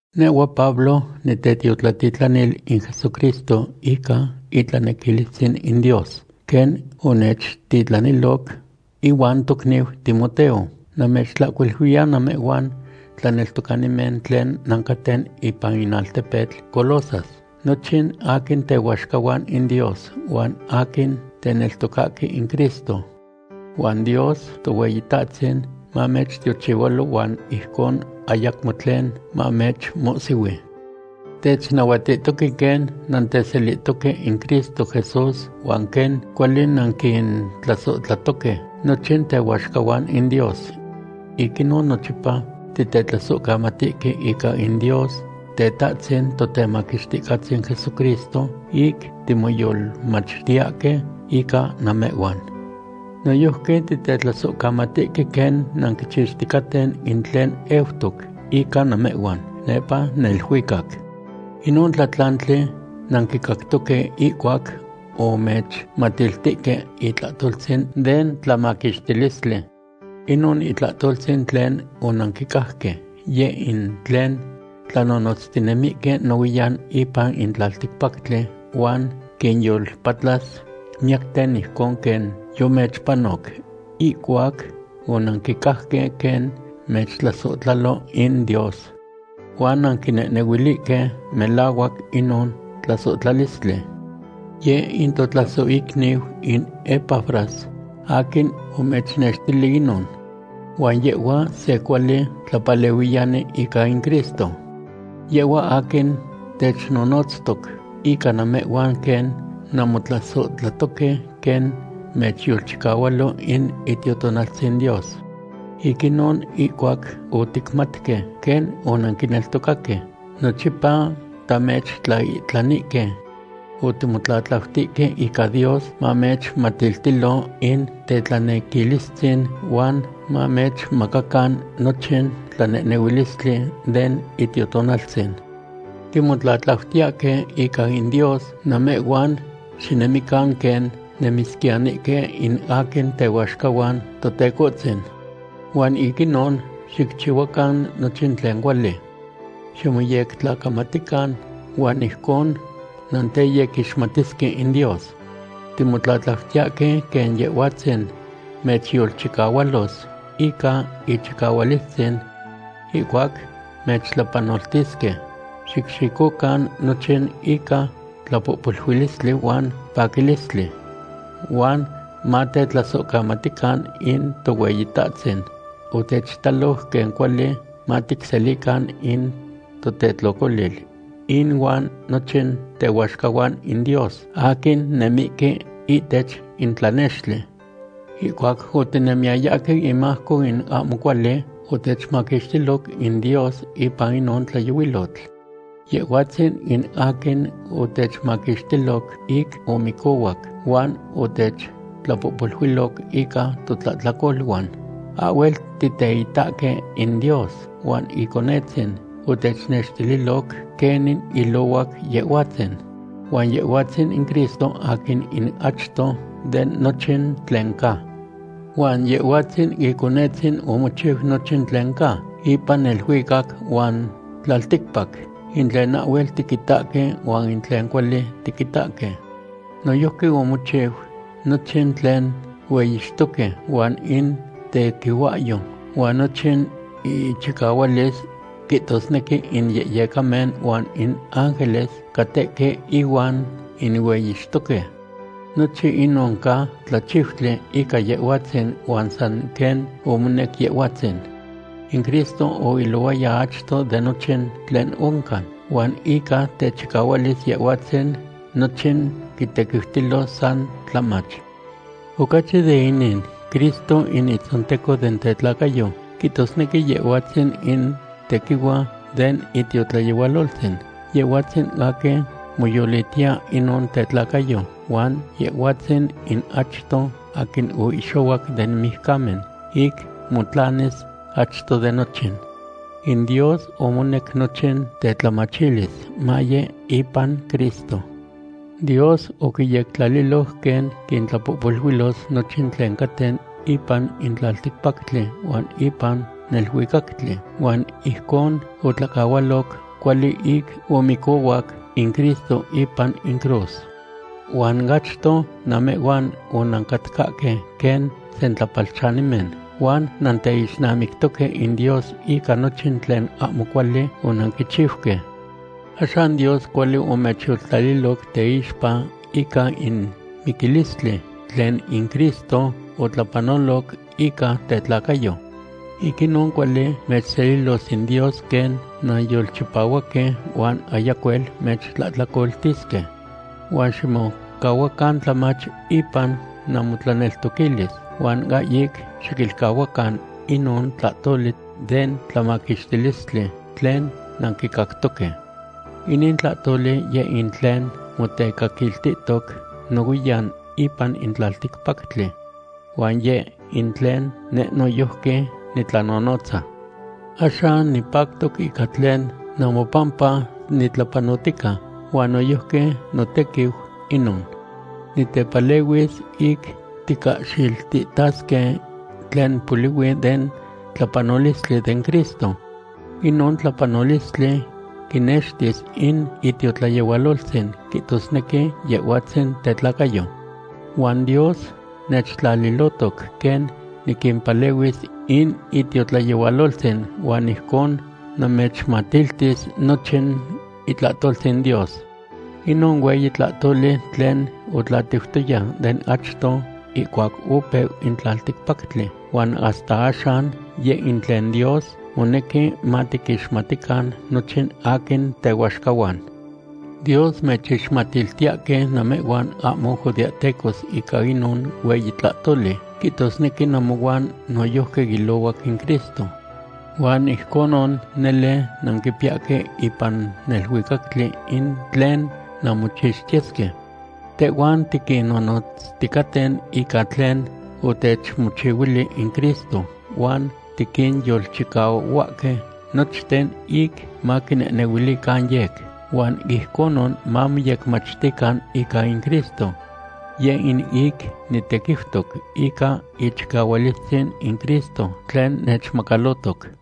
Nehhua Pablo, nitetiotlatitlanil in Jesucristo ica itlanequilistzin in Dios, quen onechtitlaniloc. Ihuan tocniu Timoteo, namechtlahcuiluiya namehhuan tlaneltocanimen tlen nancaten ipan in altepetl Colosas, nochin aquin tehuaxcahuan in Dios, huan aquin teneltocahque in Cristo. Huan Dios Tohueyitahtzin mamechtiochihualo huan ijcon ayacmo tlen mamechmohsihui. Technahuatihtoque quen nanteselihtoque in Cristo Jesús huan quen cuali nanquintlasohtlatoque nochin tehuaxcahuan in Dios. Ic inon nochipa tictlasohcamatihque ica in Dios, Tetahtzin Totemaquixticahtzin Jesucristo ic timoyolmachtiyahque ica namehhuan. Noyojqui titetlasohcamatihque quen nanquichixticaten in tlen eutoc ica namehhuan nepa neluicac. Inon tlatlantli nanquicactoque ihcuac omechmatiltihque itlahtoltzin den tlamaquixtilistli. Inon itlahtoltzin tlen onanquicajque, yeh in tlen tlanonotztinemihque nohuiyan ipan in tlalticpactli huan quinyolpatlas miyacten ijcon quen yomechpanoc ihcuac onanquicajque quen mechtlasohtlalo in Dios. Huan nanquinehnehuilihque melahuac inon tlasohtlalistli. Yeh in totlasohicniu in Epafras aquin omechnextili inon. Huan yehhua se cuali tlapalehuiyani ica in Cristo. Yehhua aquin technonotztoc ica namehhuan quen nanmotlasohtlatoque quen mechyolchicahualo in Itiotonaltzin Dios. Ic inon, ihcuac oticmatque quen onanquineltocaque, nochipa tamechtlaihtlanihque. Otimotlatlautihque ica Dios mamechmatiltilo in tetlanequilistzin huan mamechmacacan nochin tlanehnehuilistli den Itiotonaltzin. Timotlatlautiyahque ica in Dios namehhuan xinemican quen nemisquiyanihque in aquin tehuaxcahuan Totecohtzin. Huan ic inon xicchihuacan nochin tlen cuali. Ximoyecmachtican huan ijcon nanteyequixmatisque in Dios. Timotlatlautiyahque quen Yehhuatzin mechyolchicahualos ica ichicahualistzin. Ihcuac mechtlapanoltisque, xicxicocan nochin ica tlapohpoluilistli huan paquilistli. Huan matetlasohcamatican in Tohueyitahtzin otechitaloc quen cuali maticselican in totetlocolil inuan nochin tehuaxcahuan in Dios aquin nemihque ihtech in tlanextli. Ihcuac otinemiyayahque inmajco in ahmo cuali, otechmaquixtiloc in Dios ipan inon tlayohuilotl. Yehhuatzin in aquin otechmaquixtiloc ic omicohuac huan otechtlapohpoluiloc ica totlahtlacoluan. Ahhuel titeitahque in Dios huan Iconetzin otechnextililoc quenin ilohuac Yehhuatzin. Huan Yehhuatzin in Cristo aquin in achto de nochin tlen ca. Huan Yehhuatzin Iconetzin omochiu nochin tlen ca ipan neluicac huan tlalticpac, in tlen ahhuel tiquitahque huan in tlen cuali tiquitahque. Noyojqui omochiu nochin tlen hueyixtoque huan in tequihuahyo huan nochin inchicahualis, quihtosnequi in yehyecamen huan in ángeles catehque ihuan inueyixtoque. Nochin inon ca tlachiutli ica Yehhuatzin huan san quen omonec Yehhuatzin. In Cristo oilohuaya achto de nochin tlen oncan, huan ica techicahualis Yehhuatzin nochin quitequiutilo san tlamach. Ocachi de inin, Cristo in itzonteco den tetlacayo, quihtosnequi Yehhuatzin in tequihua den itiotlayehualoltzin. Yehhuatzin aquin moyolitiya inon tetlacayo, huan Yehhuatzin in achto aquin oihxohuac den mijcamen, ic motlanis achto de nochin. In Dios omonec nochin tetlamachilis maye ipan Cristo. Dios oquiyectlaliloc quen quintlapohpoluilos nochin tlen caten ipan in tlalticpactli huan ipan neluicactli, huan ijcon otlacahualoc cuali ic omicohuac in Cristo ipan in cruz. Huan achto namehhuan onancatcahque quen sentlapalchanimen huan nanteixnamictoque in Dios ica nochin tlen ahmo cuali onanquichiuque. Axan Dios cuali omechyoltlaliloc teixpa ica in miquilistli tlen in Cristo otlapanoloc ica tetlacayo. Ic inon cuali mechselilos in Dios quen nanyolchipahuaque huan ayacuel mechtlahtlacoltisque. Huan ximocahuacan tlamach ipan namotlaneltoquilis, huan ahyic xiquilcahuacan inon tlahtoli den tlamaquixtilistli tlen nanquicactoque. Inin tlahtoli yeh in tlen motecaquiltihtoc nohuiyan ipan in tlalticpactli. Huan yeh in tlen neh noyojqui nitlanonotza. Axan nipactoc ica tlen namopampa nitlapanotica, huan noyojqui notequiu inon. Nitepalehuis ic ticahxiltihtasque tlen polihui den tlapanolistli den Cristo. Inon tlapanolistli quinextis in itiotlayehualoltzin, quihtosnequi Yehhuatzin tetlacayo. Huan Dios nechtlalilotoc quen niquimpalehuis in itiotlayehualoltzin, huan ijcon namechmatiltis nochin itlahtoltzin Dios. Inon hueyi tlahtoli tlen otlatiutoya den achto ihcuac opeu in tlalticpactli huan hasta axan, yeh in tlen Dios monequi matiquixmatican nochin aquin tehuaxcahuan. Dios mechixmatiltiyahque namehhuan ahmo judeahtecos ica inon hueyi tlahtoli, quihtosnequi namohuan noyojqui ilohuac in Cristo. Huan ijconon nele nanquipiyahque ipan neluicactli in tlen nanmochixtiyesque. Tehhuan tiquinnonotzticaten ica tlen otechmochihuili in Cristo huan tiquinyolchicahuahque nochten ic maquinehnehuilican yec, huan ijconon mamoyecmachtican ica in Cristo. Yeh in ic nitequiutoc ica ichicahualistzin in Cristo tlen nechmacalotoc.